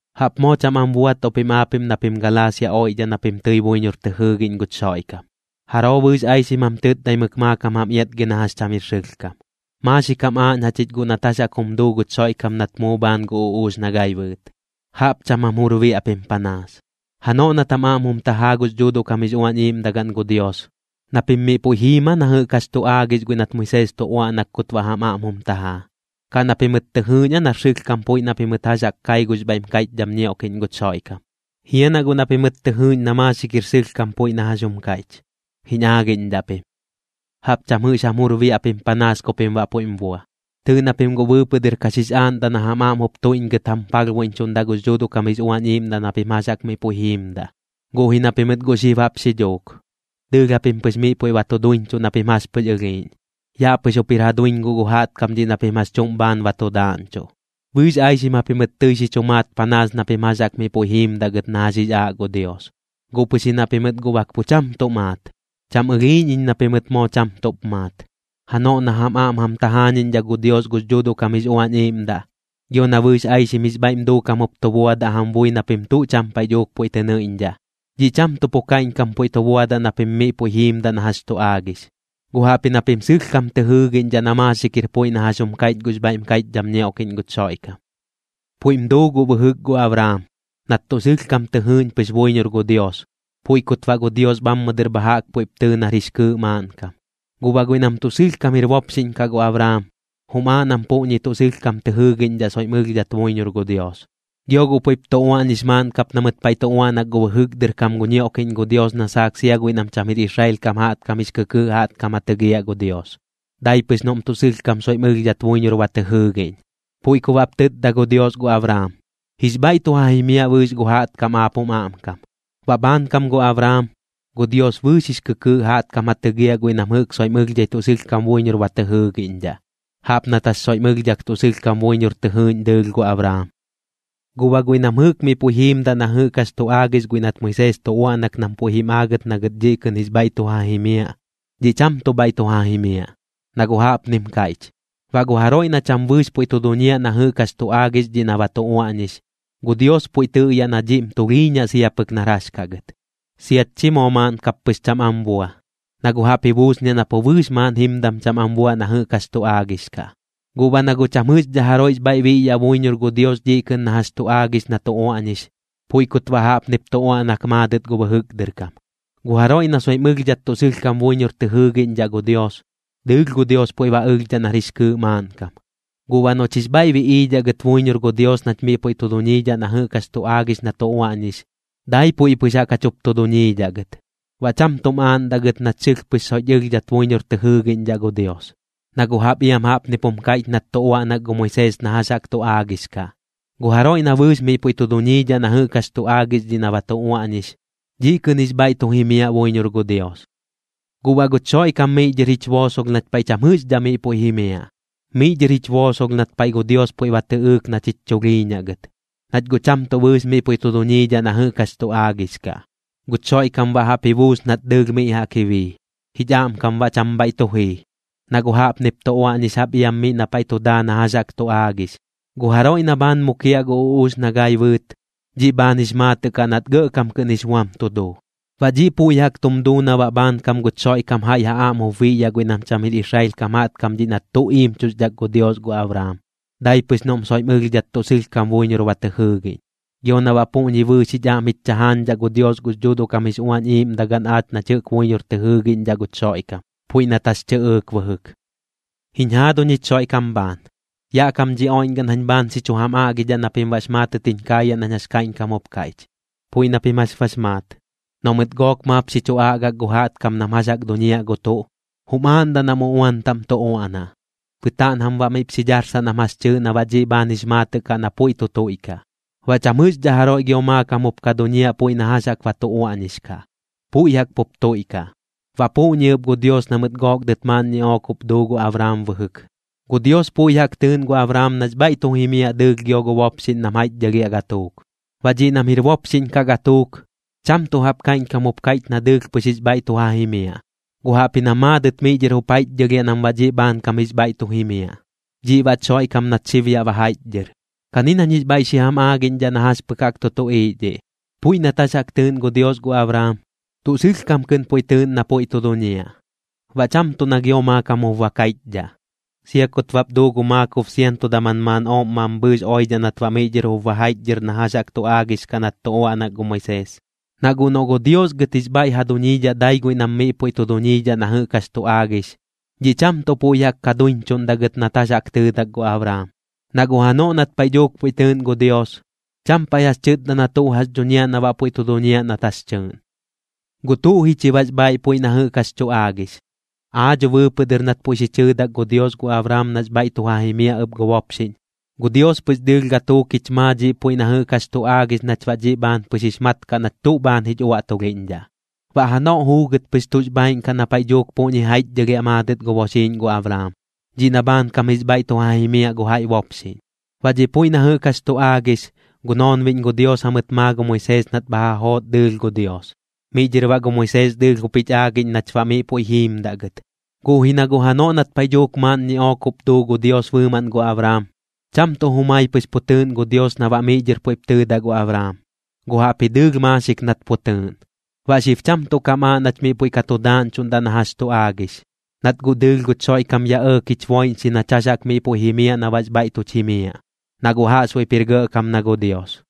¡Jaꞌp moo cham am buatuꞌ pim aapiꞌm na pim Galaasia oiꞌdhaꞌ na pim tɨi buiñor tɨ jɨɨgiꞌñ guch Xoiꞌkam! ¿Jaroo bɨɨx aixim jam tɨtdaimɨk maakam jam iatgi na jax cham jir sɨlhkam? Maaxik jam aaꞌñ jachich guꞌ nat jax jaꞌk jum duu guch Xoiꞌkam nat muu bhaan gu uꞌuux na gai bɨɨt. ¡Jaꞌp cham jam jur biaꞌ pim panaas! Janoꞌ nat jam aꞌm jum tajaa gux Dhuuduꞌ kam jix Uañ Iiꞌmdagaꞌn gu Dios, ¿na pim miꞌ puiꞌ jiim aa na jɨꞌk jax tu aagix guiꞌ nat Moisees tu uaꞌnak kut baꞌ jam aꞌm jum tajaa, kaꞌ na pimɨt tɨ jɨɨꞌñ aa nar sɨlhkam puiꞌ na pimɨt jax jaꞌk kai gux bhaiꞌm kaiꞌchdham ñioꞌkiꞌñ guch Xoiꞌkam? ¿Jia na guꞌ na pimɨt tɨ jɨɨꞌñ na maaxik jir sɨlhkam puiꞌ na jax jum kaiꞌch? Jiñ aagiꞌñdhaꞌ pim. ¡Jaꞌp cham jɨꞌx jam jur biaꞌ pim panaas ku pim baꞌ puiꞌm bua! Tɨɨꞌ na pim guꞌ bɨɨpɨꞌ dɨr ka xix aaꞌndaꞌ na jam aꞌm jup tuiꞌñgɨt jam palhbuiꞌñchuꞌndaꞌ gux Dhuuduꞌ kam jix Uañ Iiꞌmdaꞌ na pim jax jaꞌk miꞌ puiꞌ jiimdaꞌ, guꞌ ji na pimɨt guꞌ xib jaꞌp xi dhuuk, dɨɨlh japim pɨx miꞌ puiꞌ ba tu duiñchuꞌ na pim jax pɨx ɨlhiiꞌñ. Yaꞌ pɨx jup jir ja duiñ guꞌ gu jaꞌtkam dhiꞌ na pim jax chuꞌm bhaan ba tu daaꞌñchuꞌ. Bɨɨx aixim japimɨt tɨi xi chu maat panaas na pim jax jaꞌk miꞌ puiꞌ jiimdaꞌ gɨt na jax jix aaꞌ gu Dios, guꞌ pɨx ji na pimɨt guꞌ bak pu cham tuꞌ maat. Cham ɨlhiiꞌñ iñ na pimɨt moo cham tuꞌp maat. Janoꞌ na jam aꞌm jam tajaañiꞌñdhaꞌ gu Dios gux Dhuuduꞌ kam jix Uañ Iiꞌmdaꞌ, gio na bɨɨx aixim jix bhaiꞌm duukam jup tu buadaꞌ jam bui na pim tuꞌ cham paiꞌ dhuuk puiꞌ tɨ nɨiꞌñdhaꞌ, dhiꞌ cham tuꞌ pu kaiꞌñkam puiꞌ tu buadaꞌ na pim miꞌ puiꞌ jiimdaꞌ na jax tu aagix, guꞌ jaꞌpji na pim sɨlhkam tɨ jɨɨgiꞌñdhaꞌ na maaxik jir puiꞌ na jax jum kaiꞌch gux bhaiꞌm kaiꞌchdham ñioꞌkiꞌñ guch Xoiꞌkam. Puiꞌm duu guꞌ bɨjɨk gu Abraam, nat tuꞌ sɨlhkam tɨ jɨɨꞌñ pɨx buiñor gu Dios, puiꞌ kut baꞌ gu Dios bhammɨ dɨr bha jaꞌk puiꞌp tɨɨ nar jix kɨɨꞌ maaꞌnkam. Guꞌ baꞌ guiꞌ nam tuꞌ sɨlhkam jir bopxiꞌñ kaꞌ gu Abraam, jum aaꞌ nam puꞌñi tuꞌ sɨlhkam tɨ jɨɨgiꞌñdhaꞌ soiꞌm ɨlhdhat buiñor gu Dios. Gio guꞌ puiꞌp tu uaꞌñix maaꞌn kap na mɨt paiꞌ tu uaꞌnak gu bɨjɨk dɨr kam gu ñioꞌkiꞌñ gu Dios na saak sia guiꞌ nam cham jir Israel kam jaꞌtkam jix kɨkɨɨꞌ jaꞌtkam ja tɨgiaꞌ gu Dios, dai pɨx noꞌm tuꞌ sɨlhkam soiꞌm ɨlhdhat buiñor ba tɨ jɨɨgiꞌñ. Puiꞌ ku baꞌp tɨtda gu Dios gu Abraam: “Jix bhaiꞌ tu ja jimiaꞌ bɨɨx gu jaꞌtkam aap jum aꞌmkam.” Baꞌ bhaankam gu Abraam, gu Dios bɨɨx jix kɨkɨɨꞌ jaꞌtkam ja tɨgiaꞌ guiꞌ nam jɨꞌk soiꞌm ɨlhdhai tuꞌ sɨlhkam buiñor ba tɨ jɨɨꞌñdhaꞌ, jaꞌp nat jax soiꞌm ɨlhdhak tuꞌ sɨlhkam buiñor tɨ jɨɨꞌñ dɨɨlh gu Abraam. Guꞌ baꞌ guiꞌ nam jɨꞌk miꞌ puiꞌ jiimdaꞌ na jɨꞌk jax tu aagix guiꞌ nat Moisees tu uaꞌnak nam puiꞌ jim aagɨt na gɨt dhiꞌ kɨꞌn jix bhaiꞌ tu ja jimiaꞌ, dhiꞌ cham tuꞌ bhaiꞌ tu ja jimiaꞌ. Na guꞌ jaꞌpnim kaiꞌch: “Baꞌ gu jaroiꞌ na cham bɨɨx puiꞌ tu duñiaꞌ na jɨꞌk jax tu aagix dhiꞌ na ba tu uaꞌñix, gu Dios puiꞌ tɨꞌyaꞌ na dhiꞌm tulhiiñaꞌ sia pɨk nar jax kaꞌ gɨt. Siat chi moo maaꞌn kap pɨx cham am bua, na guꞌ jaꞌp ji buusniaꞌ na pu bɨɨx maaꞌn jimdam cham am buaꞌ na jɨꞌk jax tu aagix kaꞌ.” Guꞌ baꞌ na guꞌ cham jɨꞌxdhaꞌ jaroiꞌx bhaiꞌ biꞌyaꞌ buiñor gu Dios dhiꞌ kɨꞌn na jax tu aagix na tu uaꞌñix, puiꞌ kut baꞌ jaꞌpnip tu uaꞌnak maadɨt gu bɨjɨk dɨr kam: “Gu jaroiꞌ na soiꞌm ɨlhdhat tuꞌ sɨlhkam buiñor tɨ jɨɨgiꞌñdhaꞌ gu Dios, dɨɨlh gu Dios puiꞌ ba ɨlhdhaꞌ nar jix kɨɨꞌ maaꞌnkam.” Guꞌ baꞌ noꞌch jix bhaiꞌ biꞌiidhaꞌ gɨt buiñor gu Dios nach miꞌ puiꞌ tu duñiidhaꞌ na jɨꞌk jax tu aagix na tu uaꞌñix, dai puiꞌ pɨx jaꞌk jach jup tu duñiidhaꞌ gɨt, baꞌ cham tuꞌm aaꞌndaꞌ gɨt nach sɨlh pɨx soiꞌch ɨlhdhat buiñor tɨ jɨɨgiꞌñdhaꞌ gu Dios. Na guꞌ jaꞌp iam jaꞌpnip jum kaiꞌch nat tu uaꞌnak gu Moisees na jax jaꞌk tu aagix kaꞌ: “Gu jaroiꞌ na bɨɨx miꞌ puiꞌ tu duñiidhaꞌ na jɨꞌk jax tu aagix dhiꞌ na ba tu uaꞌñix, dhiꞌ kɨꞌn jix bhaiꞌ tu jimiaꞌ buiñor gu Dios.” Guꞌ baꞌ guch Xoiꞌkam miꞌ dhɨr jich boosolh nach paiꞌ cham jɨꞌxdhaꞌ miꞌ puiꞌ jimiaꞌ, miꞌ dhɨr jich boosolh nat paiꞌ gu Dios puiꞌ ba tɨꞌɨɨk nach jich chulhiiñaꞌ gɨt, nach guꞌ cham tuꞌ bɨɨx miꞌ puiꞌ tu duñiidhaꞌ na jɨꞌk jax tu aagix kaꞌ. Guch Xoiꞌkam baꞌ jaꞌp ji buus nat dɨɨlh miꞌ jaꞌk ji bii, jich aꞌmkam baꞌ cham bhaiꞌ tu jii. Na guꞌ jaꞌpnip tu uaꞌñix jaꞌp iam miꞌ na paiꞌ tu daa na jax jaꞌk tu aagix: “Gu jaroiꞌ na bhaan mukiaꞌ gu uꞌuux na gai bɨɨt, dhiꞌ bhaan jix maatɨꞌ kaꞌ nat gɇꞌkam kɨꞌn jix buam tu duu.” Baꞌ dhiꞌ puiꞌ jaꞌk tum duu na baꞌ bhaankam guch Xoiꞌkam jaiꞌ ja aꞌm jup biꞌyaꞌ guiꞌ nam cham jir Israel kam jaꞌtkam dhiꞌ nat tuꞌ iimchuxdhak gu Dios gu Abraam, dai pɨx noꞌm soiꞌm ɨlhdhat tuꞌ sɨlhkam buiñor ba tɨ jɨɨgiꞌñ. Gio na baꞌ puꞌñi bɨɨx jich aꞌm jich chajaañdhaꞌ gu Dios gux Dhuuduꞌ kam jix Uañ Iiꞌmdagaꞌn aach nach jɨꞌk buiñor tɨ jɨɨgiꞌñdhaꞌ guch Xoiꞌkam, puiꞌ nat jax tɨꞌɨɨk bɨjɨk. Jiñ jaaduñ jich Xoiꞌkam bhaan, yaꞌ kam dhi oiꞌñgaꞌn jañ bhaan xi chu jam aꞌgidhaꞌ na pim baꞌx maatɨt jiñ kaayaꞌ nañ jax kaiꞌñkam jup kaiꞌch. Puiꞌ na pim jax bax maat, noꞌ mɨt gook maap xi chu aꞌgak gu jaꞌtkam nam jax jaꞌk duñia gu tuꞌ, jum aaꞌndaꞌ nam uꞌuan taꞌm tu uaꞌnaꞌ, bɨtaaꞌn jam baꞌ miꞌp xi dharsaꞌ nam jax tɨɨꞌ na baꞌ dhiꞌ bhaan jix maatɨꞌ kaꞌ na puiꞌ tu tuiꞌkaꞌ. Baꞌ cham jɨꞌxdhaꞌ jaroiꞌ gio maakam jup ka duñiaꞌ puiꞌ na jax jaꞌk ba tu uaꞌñix kaꞌ, puiꞌ jaꞌk pup tuiꞌkaꞌ. Baꞌ puꞌñi ɨp gu Dios na mɨt gook dɨt maaꞌn ñiꞌook jup duu gu Abraam bɨjɨk. Gu Dios puiꞌ jaꞌk tɨɨꞌn gu Abraam nax bhaiꞌ tu jimiaꞌ dɨɨlh gio gu bopxiꞌñ nam jaiꞌchdhɨlhiaꞌ gatuuk. Baꞌ dhiꞌ nam jir bopxiꞌñ kaꞌ gatuuk, cham tuꞌ jaꞌp kaiꞌñkam jup kaiꞌch na dɨɨlh pɨx jix bhaiꞌ tu ja jimiaꞌ, guꞌ jaꞌpji na maadɨt miꞌ dhɨr jup jaiꞌchdhɨlhiaꞌ nam baꞌ dhiꞌ bhaankam jix bhaiꞌ tu jimiaꞌ, dhiꞌ baꞌch Xoiꞌkam nat xib yaꞌ ba jaiꞌchdhɨr. Kani nañ jix bhaiꞌ xi jam aagiꞌñdhaꞌ na jax pɨk jaꞌk tu tuꞌiiꞌ dhiꞌ. Puiꞌ nat jax jaꞌk tɨɨꞌn gu Dios gu Abraam, tuꞌ sɨlhkam kɨꞌn puiꞌ tɨɨꞌn na puiꞌ tu duñiaꞌ, baꞌ cham tuꞌ na gio maakam jup ba kaiꞌchdhaꞌ, sia kut bap duu gu maakob sianto daman maaꞌn ooꞌm mambhɨɨx oiꞌdhaꞌ nat baꞌ miꞌ dhɨr jup ba jaiꞌchdhɨr na jax jaꞌk tu aagix kaꞌ nat tu uaꞌnak gu Moisees. Na guꞌ noꞌ gu Dios gɨt jix bhaiꞌ ja duñiidhaꞌ dai guiꞌ nam miꞌ puiꞌ tu duñiidhaꞌ na jɨꞌk jax tu aagix, dhiꞌ cham tuꞌ puiꞌ jaꞌk ka duiñchuꞌndaꞌ gɨt nat jax jaꞌk tɨɨdak gu Abraam. Na guꞌ janoꞌ nat paiꞌ dhuuk puiꞌ tɨɨꞌn gu Dios, cham paiꞌ jax tɨtda na tuꞌ jax xi dhuñiaꞌ na baꞌ puiꞌ tu duñiaꞌ nat jax tɨɨꞌn. ¿Guꞌ tuꞌ ji chi baꞌx bhaaiꞌ puiꞌ na jɨꞌk jax tu aagix? Aa dho bɨɨpɨꞌ dɨr nat puiꞌ xi chɨɨdak gu Dios gu Abraam nax bhaiꞌ tu ja jimiaꞌ ɨp gu bopxiꞌñ, gu Dios pɨx dɨɨlh gatuuk jich maa dhiꞌ puiꞌ na jɨꞌk jax tu aagix nach baꞌ dhiꞌ bhaan pɨx jix mat kaꞌ nach tuꞌ bhaan jich uaꞌtulhiꞌñdhaꞌ, baꞌ janoꞌ juugɨt pɨx tuꞌx bhaaiꞌn kaꞌ na paiꞌ dhuuk puꞌñi jaiꞌchdhɨlhiaꞌ maadɨt gu boxiiꞌñ gu Abraam, dhiꞌ na bhaankam jix bhaiꞌ tu ja jimiaꞌ gu jaiꞌ bopxiꞌñ. Baꞌ dhiꞌ puiꞌ na jɨꞌk jax tu aagix, gu noonbiꞌñ gu Dios jamɨt maa gu Moisees nat bha ja joot dɨɨlh gu Dios, miꞌ dhɨr baꞌ gu Moisees dɨɨlh jup jich aagiꞌñ nach baꞌ miꞌ puiꞌ jiimdaꞌ gɨt. Guꞌ ji na guꞌ janoꞌ nat paiꞌ dhuuk maaꞌn ñiꞌook jup duu gu Dios bɨɨmaꞌn gu Abraam, cham tuꞌ jumai pɨx pu tɨɨꞌn gu Dios na baꞌ miꞌ dhɨr puiꞌp tɨɨdaꞌ gu Abraam, guꞌ jaꞌpji dɨɨlh maaxik nat pu tɨɨꞌn. Baꞌ xib cham tuꞌ kam aaꞌ nach miꞌ puiꞌ ka tu daaꞌñchuꞌndaꞌ na jax tu aagix, nat guꞌ dɨɨlh guch Xoiꞌkam yaꞌ ɇɇk jich boiꞌñxi nach jax jaꞌk miꞌ puiꞌ jimiaꞌ na baꞌx bhaiꞌ tuch jimiaꞌ, na guꞌ jaꞌxbuiꞌp jir gɇꞌkam na gu Dios.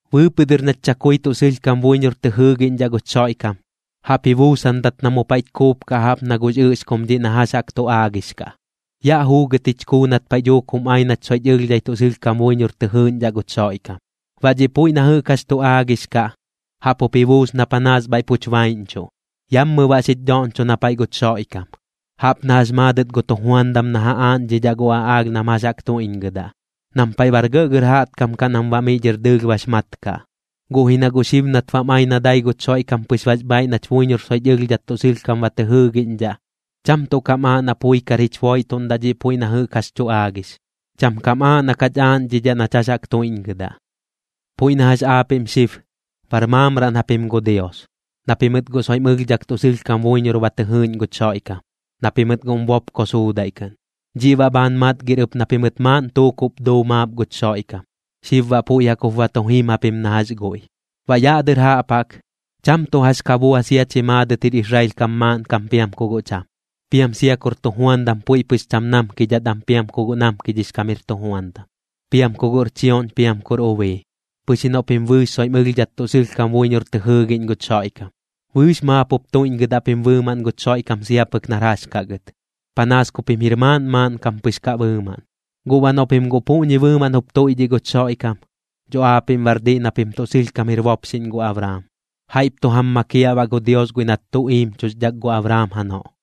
Bɨɨpɨꞌ dɨr nach chakui tuꞌ sɨlhkam buiñor tɨ jɨɨgiꞌñdhaꞌ guch Xoiꞌkam, jaꞌp ji buusandat na mu paiꞌch kuupkaꞌ jaꞌp na gux ɨꞌxkum dhiꞌ na jax jaꞌk tu aagix kaꞌ. Yaꞌ juugɨt jich kuu nat paiꞌ dhuuk jum ai nach soiꞌch ɨlhdhai tuꞌ sɨlhkam buiñor tɨ jɨɨꞌñdhaꞌ guch Xoiꞌkam. Baꞌ dhiꞌ puiꞌ na jɨꞌk jax tu aagix kaꞌ, jaꞌp jup ji buus na panaas bhaiꞌ puch baiꞌñchuꞌ, yammɨ baꞌ xich dhoꞌñcho na paiꞌ guch Xoiꞌkam. Jaꞌp na jax maadɨt gu tujuandam na ja aaꞌñdhidhaꞌ gu aꞌaalh nam jax jaꞌk tuiꞌñgɨdaꞌ, nam paiꞌ bar gɇꞌgɇr jaꞌtkam kaꞌ nam baꞌ miꞌ dhɨr dɨɨlh bax mat kaꞌ. Guꞌ ji na guꞌ xib nat bam ai na dai guch Xoiꞌkam pɨx bax bhaaiꞌ nach buiñor soiꞌch ɨlhdhat tuꞌ sɨlhkam ba tɨ jɨɨgiꞌñdhaꞌ, cham tuꞌ kam aaꞌ na pui kar jich boiꞌtuꞌndaꞌ dhiꞌ puiꞌ na jɨꞌk jax tu aagix, cham kam aaꞌ na kach aaꞌñdhidhaꞌ nach jax jaꞌk tuiꞌñgɨdaꞌ. Puiꞌ na jax aapiꞌm xib, bar maamraꞌn japim gu Dios, na pimɨt guꞌ soiꞌm ɨlhdhak tuꞌ sɨlhkam buiñor ba tɨ jɨɨꞌñ guch Xoiꞌkam, na pimɨt guꞌm bopko suudaiꞌ kɨꞌn. Dhiꞌ baꞌ bhaan matgir ɨp na pimɨt maaꞌn tuukuꞌp duu maap guch Xoiꞌkam, xib baꞌ puiꞌ jaꞌk jup ba tu jim japim na jax guiꞌ. Baꞌ yaꞌ dɨr jaꞌp jaꞌk, cham tuꞌ jax ka bua sia chi maadɨt jir Israel kam maaꞌnkam piam ku guꞌ cham, piam sia kur tujuandam puiꞌ pɨx cham namkidhat am piam ku guꞌ namkidhix kam jir tujuandam, piam ku guꞌr chioꞌñ piam kur ubii, pɨx ji noꞌ pim bɨɨx soiꞌm ɨlhdhat tuꞌ sɨlhkam buiñor tɨ jɨɨgiꞌñ guch Xoiꞌkam. Bɨɨx maap jup tuiꞌñgɨdaꞌ pim bɨɨmaꞌn guch Xoiꞌkam sia pɨk nar jax kaꞌ gɨt, panaas ku pim jir maaꞌn maaꞌnkam pɨx kaꞌ bɨɨmaꞌn. Guꞌ baꞌ noꞌ pim guꞌ puꞌñi bɨɨmaꞌn jup tuiꞌdhiꞌ guch Xoiꞌkam, dho aapiꞌm baꞌr diꞌ na pim tuꞌ sɨlhkam jir bopxiꞌñ gu Abraam. Jaiꞌp tu jam makiaꞌ baꞌ gu Dios guiꞌ nat tuꞌ iimchuxdhak gu Abraam janoꞌ.